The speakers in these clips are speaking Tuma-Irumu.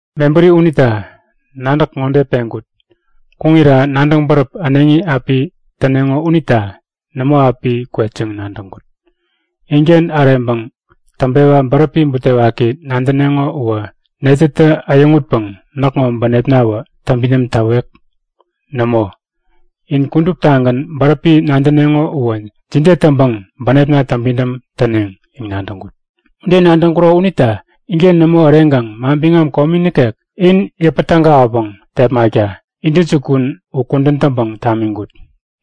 Mebäri unita nadäk ŋode peŋkut; Kuŋira nadäŋ bäräp äneŋi api täneŋo unita nämo api kwet yäŋ nadäŋkut. Inken äreŋpäŋ täŋpewa bäräpi butewaki nadäneŋo uwä netätä äyäŋutpäŋ näkŋo bänepnawä täŋpidäm täwek? Nämo, in kuduptagän bäräpi nadäneŋo uwä jide täŋpäŋ bänepna täŋpidäm täneŋ yäŋ nadäŋkut. Ude nadäŋkuro unita inken nämo äreŋkaŋ manbiŋam komi nikek in yäpän tägawäpäŋ tepmakta intäjukun u kudän täŋpäŋ tamiŋkut.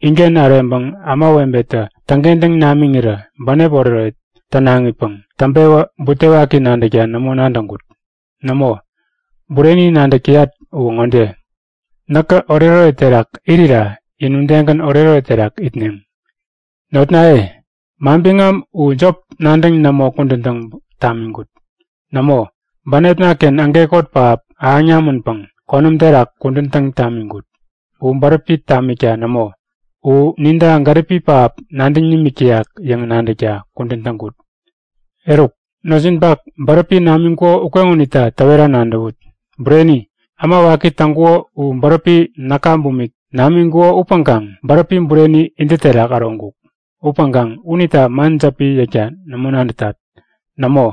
Inken äreŋpäŋ ämawebetä täŋkentäŋ namiŋirä bänep oretoret tänaŋipäŋ täŋpewä butewaki nadäkta nämo nadäŋkut. Nämo, bureni nadäk täyat uwä ŋode; Näkä oretoret terak irira in udegän oretoret terak itneŋ. Notnaye, manbiŋam u jop nadäŋ nämo kudän täŋ tamiŋkut. Nämo, bänepna-ken ägekot pähap ahäŋ namänpäŋ konäm terak kudän täŋ tamiŋkut. U bäräpi tamikta nämo, u ninta gäripi pähap nadäŋ nimik täyak yäŋ nadäkta kudän täŋkut. Eruk, notjinpak bäräpi namiŋkuko ukeŋonita täwera nadäwut. Bureni, äma waki täŋkuko u bäräpi näka bumik namiŋkuko upäŋkaŋ bäräpi bureni intä terak äroŋkuk. Upäŋkaŋ unita man jäpi yäkta nämo nadätat. Nämo,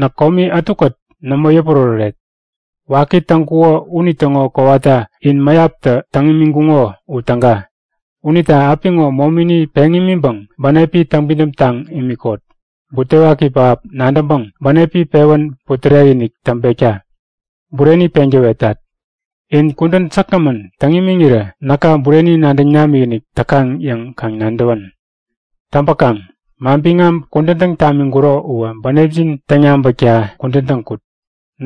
näk komi ätukät nämo yäpuräräret. Waki täŋkuko unitäŋo kowata in mäyaptä täŋ imiŋkuŋo u täga. Unita apiŋo momini peŋ imiŋpäŋ bänepi täŋpidäm taŋ imikot, butewaki pähap nadäŋpäŋ bänepi pewän putärek-inik täŋpekta. Bureni peŋ täwetat; In kudän säkgämän täŋ imiŋirä näka bureni nadäŋ namikinik täkaŋ yäŋ kaŋ nadäwän. Täŋpäkaŋ manbiŋam kudän täŋ tamiŋkuro uwä bänepjin täŋ-yabäkta kudän täŋkut.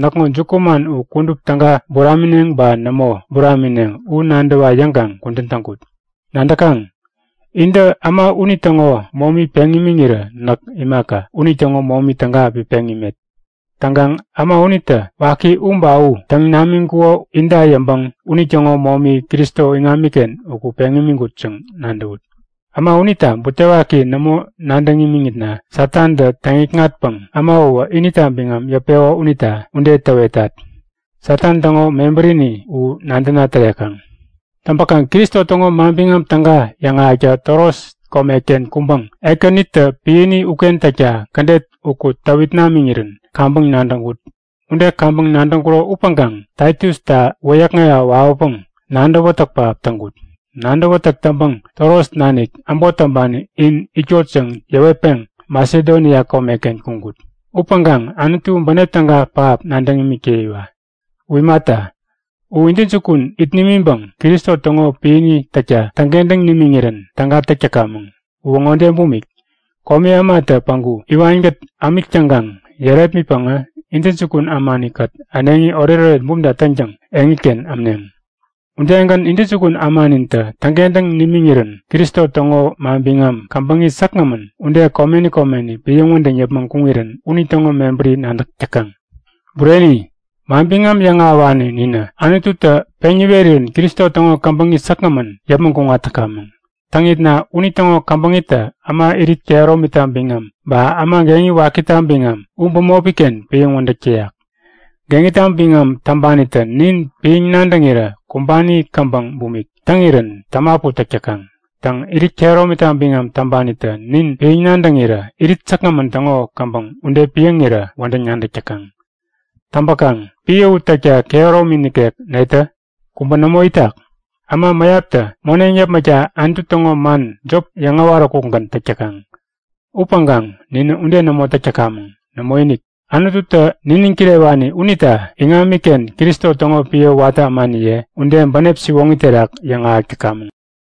Näkŋo jukuman u kudup täga buramineŋ ba nämo buramineŋ u nadäwa yäŋkaŋ kudän täŋkut. Nadäkaŋ? Intä äma unitäŋo momi peŋ imiŋirä näk imaka, unitäŋo momi täga api peŋ imet. Täŋkaŋ äma unitä waki u ba u täŋ namiŋkuko inta yäŋpäŋ unitäŋo momi Kristo iŋamiken uku peŋ imiŋkut yäŋ nadäwut. Äma unita butewaki nämo nadäŋ imiŋitna Satantä täŋ-nikŋatpäŋ äma uwä inita biŋam yäpeko unita ude täwetat. Satan täŋo mebärini u nadäna tärekaŋ. Täŋpäkaŋ Kristo täŋo Manbiŋam Täga yäŋahäkta Troas komeken kuŋpäŋ Ekänitä piäni uken täkta kädet uku täwit namiŋirän kaŋpäŋ nadäŋkut. Ude kaŋpäŋ nadäŋkuro upäŋkaŋ Taitusta wäyäkŋewa wawäpäŋ nadäwätäk pähap täŋkut. Nadäwätäk täŋpäŋ Troas nanik äbot täŋpani in itkot yäŋ yäwetpeŋ Masedonia komeken kuŋkut. Upäŋkaŋ Anutu bänep täga pähap nadäŋ imik täyiwa! U imata, u intäjukun it nimiŋpäŋ Kristo täŋo piäni täkta täŋkentäŋ nimiŋirän täga täk täkamäŋ. Uwä ŋode bumik; Komi ämatä päŋku iwankät ämik täŋkaŋ yärepmitpäŋä intäjukun ämanikät äneŋi oretoret bumta täŋtäŋ eŋiken ämneŋ. Udegän intäjukun ämanintä täŋkentäŋ nimiŋirän Kristo täŋo manbiŋam käbäŋi säkgämän ude komeni komeni piäŋ wädäŋ yäpmäŋ kuŋirän unitäŋo mebäri nadäk täkaŋ. Bureni, manbiŋam yäŋahäwani ninä Anututä peŋ niwerirän Kristo täŋo käbäŋi säkgämän yäpmäŋ kuŋat täkamäŋ. Täŋitna unitäŋo käbäŋitä äma irit kehäromita biŋam ba äma geŋi wakita biŋam u bämopi-ken piäŋ wädäk täyak. Geŋita biŋam täŋpanitä nin piäŋ nadäŋirä kumbani käbäŋ bumik täŋirän tämapu täk täkaŋ. Täŋ, irit kehäromita biŋam täŋpanitä nin piäŋ nadäŋirä irit säkgämän täŋo käbäŋ ude piäŋirän wädäŋ nadäk täkaŋ. Täŋpäkaŋ piä u täkta kehäromi nikek netä? Kubä nämo itak! Äma mäyaptä moneŋ yäpmäkta Anutu täŋo man jop yäŋ äwaräkukgän täk täkaŋ. Upäŋkaŋ ninä ude nämo täk täkamäŋ. Nämoinik, Anututä niniŋ kirewani unita iŋamiken, Kristo täŋo piä watä ämaniye ude bänep siwoŋi terak yäŋahäk täkamäŋ.